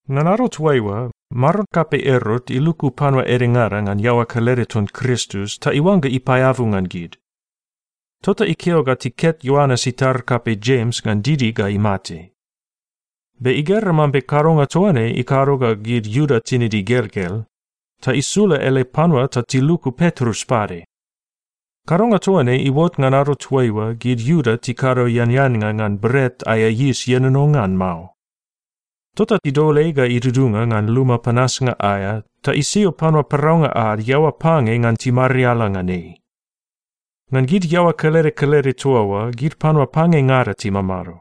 Ngan ado toaiua, maron kapei Erot iluku panua edengada ngan iaoa kelede ton Kristus ta iuangga ipaeabu ngan gid. Tota ikeo ta tiket Ioanes itar kapei Jems ngan didi ga imate. Be igera mambe kadonga toa ne ikado ga gid Iuda tinid igelgel, ta isula ele panua ta tiluku Petrus pade. Kadonga toa ne iuot ngan ado toaiua gid Iuda tikado eaneannga ngan Bret aea Yis Ienono ngan Mao. Tota idol ei ga idudunga ngan luma panasnga aea ta isio panua paraunga ad iaoa pange ngan timariala ngan ei. Ngan gid iaoa kelede kelede toa oa gid panua pangengada timamado.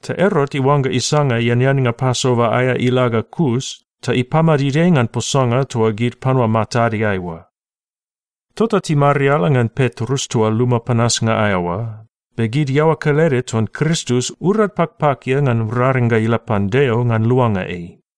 Ta Erot iuangga isanga eaneannga Pasova aea ila ga kus, ta ipamadid ei ngan posanga toa gid panua matadeai oa. Tota timariala ngan Petrus toa luma panasnga aea oa, be gid iaoa kelede ton Kristus urad pakpakia ngan raring ga ila pan Deo ngan luanga ei.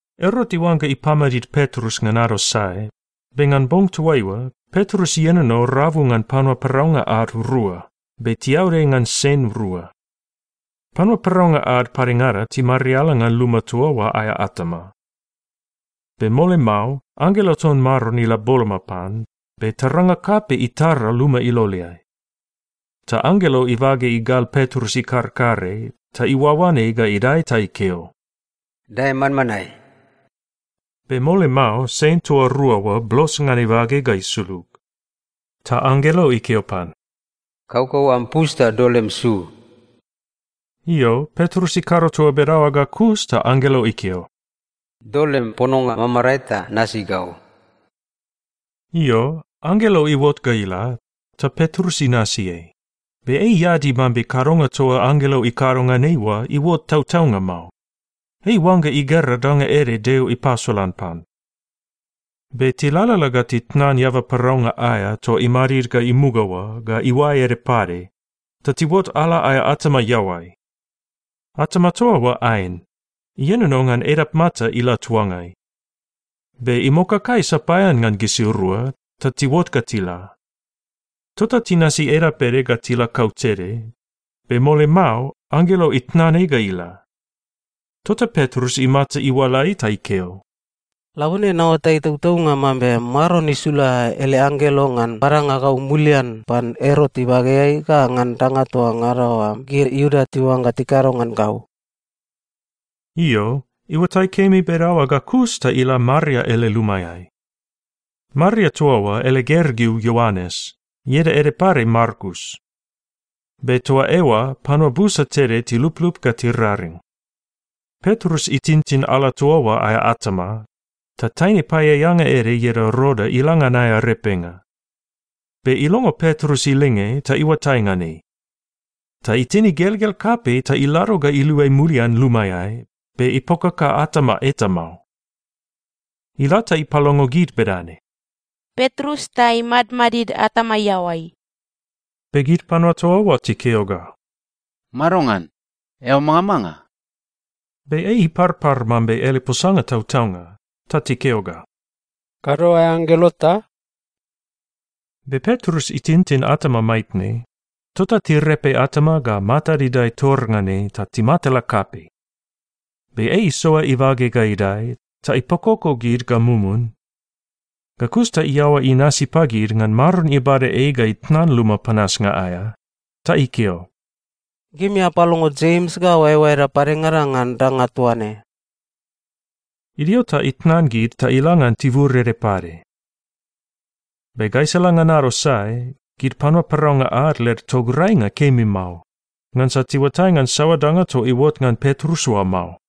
Erot iuangga ipamadid Petrus ngan ado sae, be ngan bong toaiua, Petrus ienono rabu ngan panua paraunga ad rua, be tiaud ei ngan sen rua. Panua paraunga ad padengada timariala ngan luma toa oa aea atama. Be mole mao anggelo ton Maron ila boloma pan, be taranga kapei itara luma iloleai. Ta anggelo ibage igal Petrus ikarkare, ta iuaoan ei ga idae ta ikeo, “Dae manmanae.” Be mole mao sen toa rua oa blos ngan ibage ga isulug. Ta anggelo ikeo pan, “Kaukau am pus ta dol lem su.” Io, Petrus ikado toa bedaoa ga kus ta anggelo ikeo, “Dol lem pononga mamarae ta nasi gau.” Io, anggelo iuot ga ila, ta Petrus inasi ei, be ei iadi mambe kadonga toa anggelo ikado ngan ei oa iuot tautaunga mao. Ei iuangga igera danga ede Deo ipasolan pan. Be tilalala ga titnan eaba paraunga aea toa imadid ga imuga oa ga iuae ede pade, ta tiuot ala aea atama iaoai. Atama toa oa aen. Ienono ngan edapmata ila tuangai. Be imokakai sapaean ngan gisirua, ta tiuot ga tila. Tota tinasi edap ede ga tila kautede, be mole mao anggelo itnan ei ga ila. Tota Petrus imata iualai ta ikeo, “Labone naoatai tautaunga mambe Maron isula ele anggelo ngan badanga gau mulian pan Erot ibageai ga ngan danga toa ngada oa gid Iuda tiuangga tikado ngan gau!” Io, iuatai kemi bedaoa ga kus ta ila Maria ele lumaeai. Maria toa oa ele gergeu Ioanes, ieda ede pade Markus. Be toa eoa panua busa tede tiluplup ga tiraring. Petrus itintin ala toa oa aea atama, ta taine paeaeanga ede ieda Roda ila ngan aea repenga. Be ilongo Petrus ilinge ta iuatai ngan ei. Ta itin igelgel kapei ta ilado ga iluai mulian lumaeai, be ipokaka atama eta mao. Ila ta ipalongo gid bedane, “Petrus ta imadmadid atama iaoai!” Be gid panua toa oa tikeo ga, “Madongan? Eao mangamanga?” Be ei iparpar mambe ele posanga tautaunga, ta tikeo ga, “Kado aea anggelo ta?” Be Petrus itintin atama maitne, tota tirepe atama ga matad idae tor ngan ei ta timatala kapei. Be ei isoa ibage ga idae, ta ipakoko gid ga mumun. Ga kus ta iaoa inasi pagid ngan Maron ibada ei ga itnan luma panasnga aea. Ta ikeo, “Gimi apalongo Jems ga oaeoaeda padengada ngan danga toa ne.” Idio ta itnan gid ta ila ngan tibur ede pade. Be gaisala ngan ado sae, gid panua paraunga ad led tograinga kemi mao, ngansa tiuatai ngan saoa danga toa iuot ngan Petrus oa mao.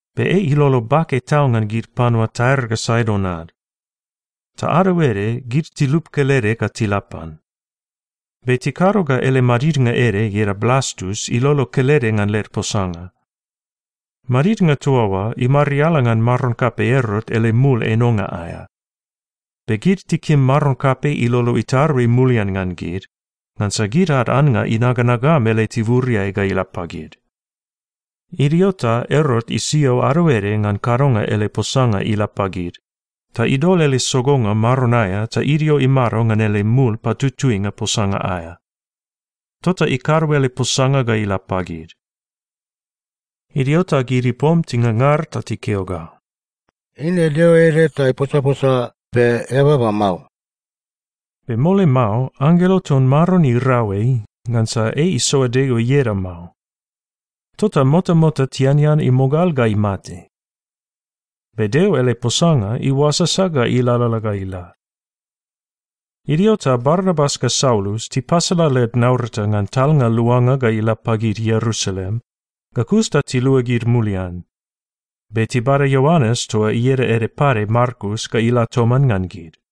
Be ei ilolo bake tau ngan gid panua Tair ga Saidon ad. Ta ado ede gid tilup kelede ga tila pan. Be tikado ga ele madidnga ede ieda Blastus ilolo kelede ngan led posanga. Madidnga toa oa imariala ngan maron kapei Erot ele mul enonga aea. Be gid tikim maron kapei ilolo itarui mulian ngan gid, ngansa gid ad annga inaganagam ele tiburiai ga ila pagid. Idio ta Erot isio ado ede ngan kadonga ele posanga ila pagid, ta idol ele sogonga maron aea ta idio imado ngan ele mul patutuinga posanga aea. Tota ikado ele posanga ga ila pagid. Idio ta gid ipom tingangar ta tikeo ga, “Eine deo ede ta iposaposa, be eababa mao!” Be mole mao anggelo ton Maron irau ei, ngansa ei isoa Deo ieda mao. Tota motamota tianean imogal ga imate. Be Deo ele posanga iuasasa ga ilalala ga ila. Idio ta Barnabas ga Saulus tipasala led naurata ngan talnga luanga ga ila pagid Ierusalem, ga kus ta tiluagid mulian. Be tibada Ioanes toa ieda ede pade Markus ga ila toman ngan gid.